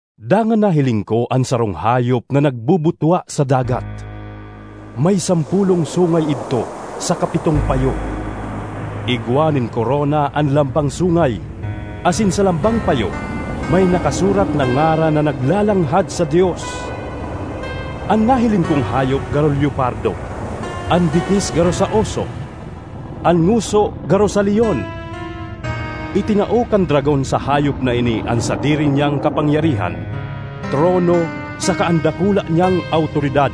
Dangan nahiling ko an sarong hayop na nagbubutwa sa dagat. May sampolong sungay idto saka pitong payo. Igwa nin korona an lambang sungay; asin sa lambang payo may nakasurat na ngaran na naglalanghad sa Dios. An nahiling kong hayop garo leopardo, an bitis garo sa oso, an ngoso garo sa leon. Itinao kan dragon sa hayop na ini an sadiri niyang kapangyarihan, trono saka an dakula niyang awtoridad.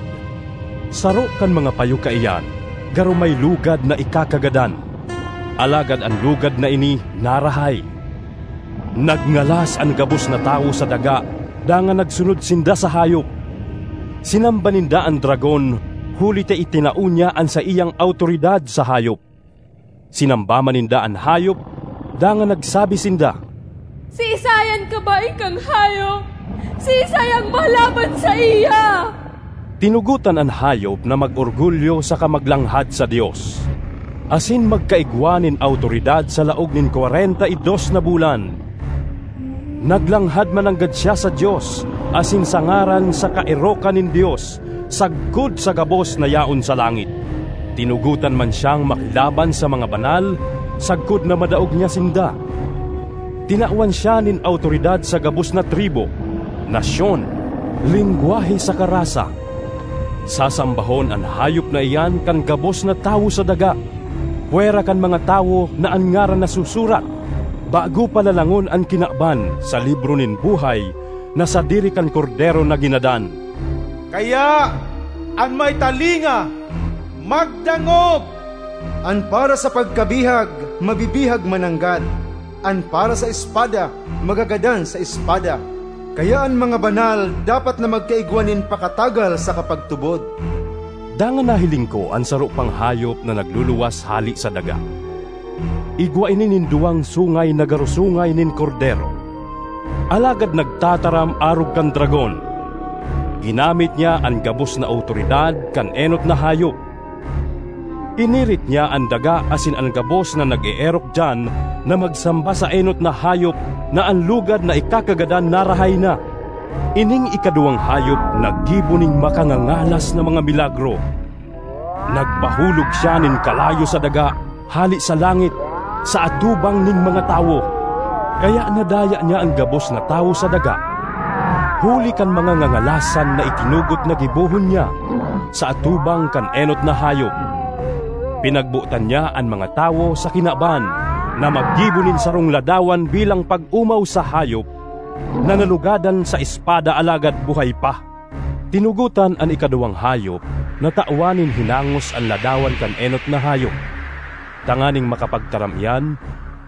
Saro kan mga payo kaiyan garo may lugad na ikakagadan, alagad an lugad na ini narahay. Nagngalas an gabos na tawo sa daga dangan nagsunod sinda sa hayop. Sinamba ninda an dragon huli ta itinao niya an saiyang awtoridad sa hayop. Sinamba man ninda an hayop dangan nagsabi sinda, “Siisay an kabaing kan hayop? Siisay an malaban saiya?” Tinugotan an hayop na mag-orgulyo saka maglanghad sa Dios, asin magkaigwa nin awtoridad sa laog nin kwarenta y dos na bulan. Naglanghad mananggad siya sa Dios asin sa ngaran saka erokan nin Dios sagkod sa gabos na yaon sa langit. Tinugotan man siyang makilaban sa mga banal sagkod na madaog niya sinda; tinawan siya nin awtoridad sa gabos na tribu, nasyon, lengwahe saka rasa. Sasambahon an hayop na iyan kan gabos na tawo sa daga, pwera kan mga tawo na an ngaran nasusurat, bago pa lalangon an kinaban, sa libro nin buhay na sadiri kan Kordero na ginadan. ”Kaya, an may talinga magdangog! An para sa pagkabihag, mabibihag mananggad; an para sa espada, magagadan sa espada. Kaya an mga banal dapat na magkaigwa nin pakatagal saka pagtubod.” Dangan nahiling ko an saro pang hayop na nagluluwas hale sa daga. Igwa ini nin duwang sungay na garo sungay nin kordero, alagad nagtataram arog kan dragon. Ginamit niya an gabos na awtoridad kan enot na hayop. Pinirit niya an daga asin an gabos na nag-eerok diyan na magsamba sa enot na hayop na an lugad na ikakagadan narahay na. Ining ikaduwang hayop naggibo nin makangangalas na mga milagro; nagpahulog siya nin kalayo sa daga hale sa langit sa atubang nin mga tawo. Kaya nadaya niya an gabos na tawo sa daga huli kan mga ngangalasan na itinugot na gibohon niya sa atubang kan enot na hayop. Pinagbotan niya an mga tawo sa kinaban na maggibo nin sarong ladawan bilang pag-omaw sa hayop na nalugadan sa espada alagad buhay pa. Tinugotan an ikaduwang hayop na tawan nin hinangos an ladawan kan enot na hayop tanganing makapagtaram iyan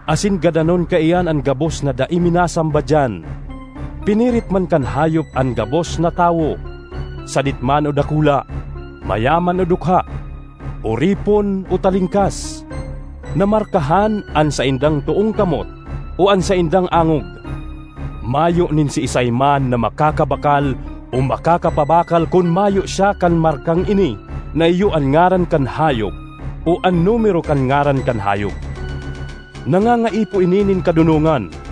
asin gadanon kaiyan an gabos na dai minasamba diyan. Pinirit man kan hayop an gabos na tawo, sadit man o dakula, mayaman o dukha, oripon o talingkas, na markahan an saindang toong kamot o an saindang angog. Mayo nin siisay man na makakabakal o makakapabakal kun mayo siya kan markang ini na iyo an ngaran kan hayop o an numero kan ngaran kan hayop. Nangangaipo ini nin kadonongan.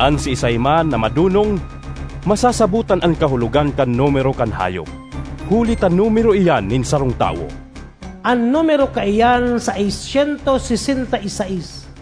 An siisay man na madonong, masasabotan an kahulogan kan numero kan hayop, huli ta numero iyan nin sarong tawo. An numero kaiyan seis syentos sesenta y seis.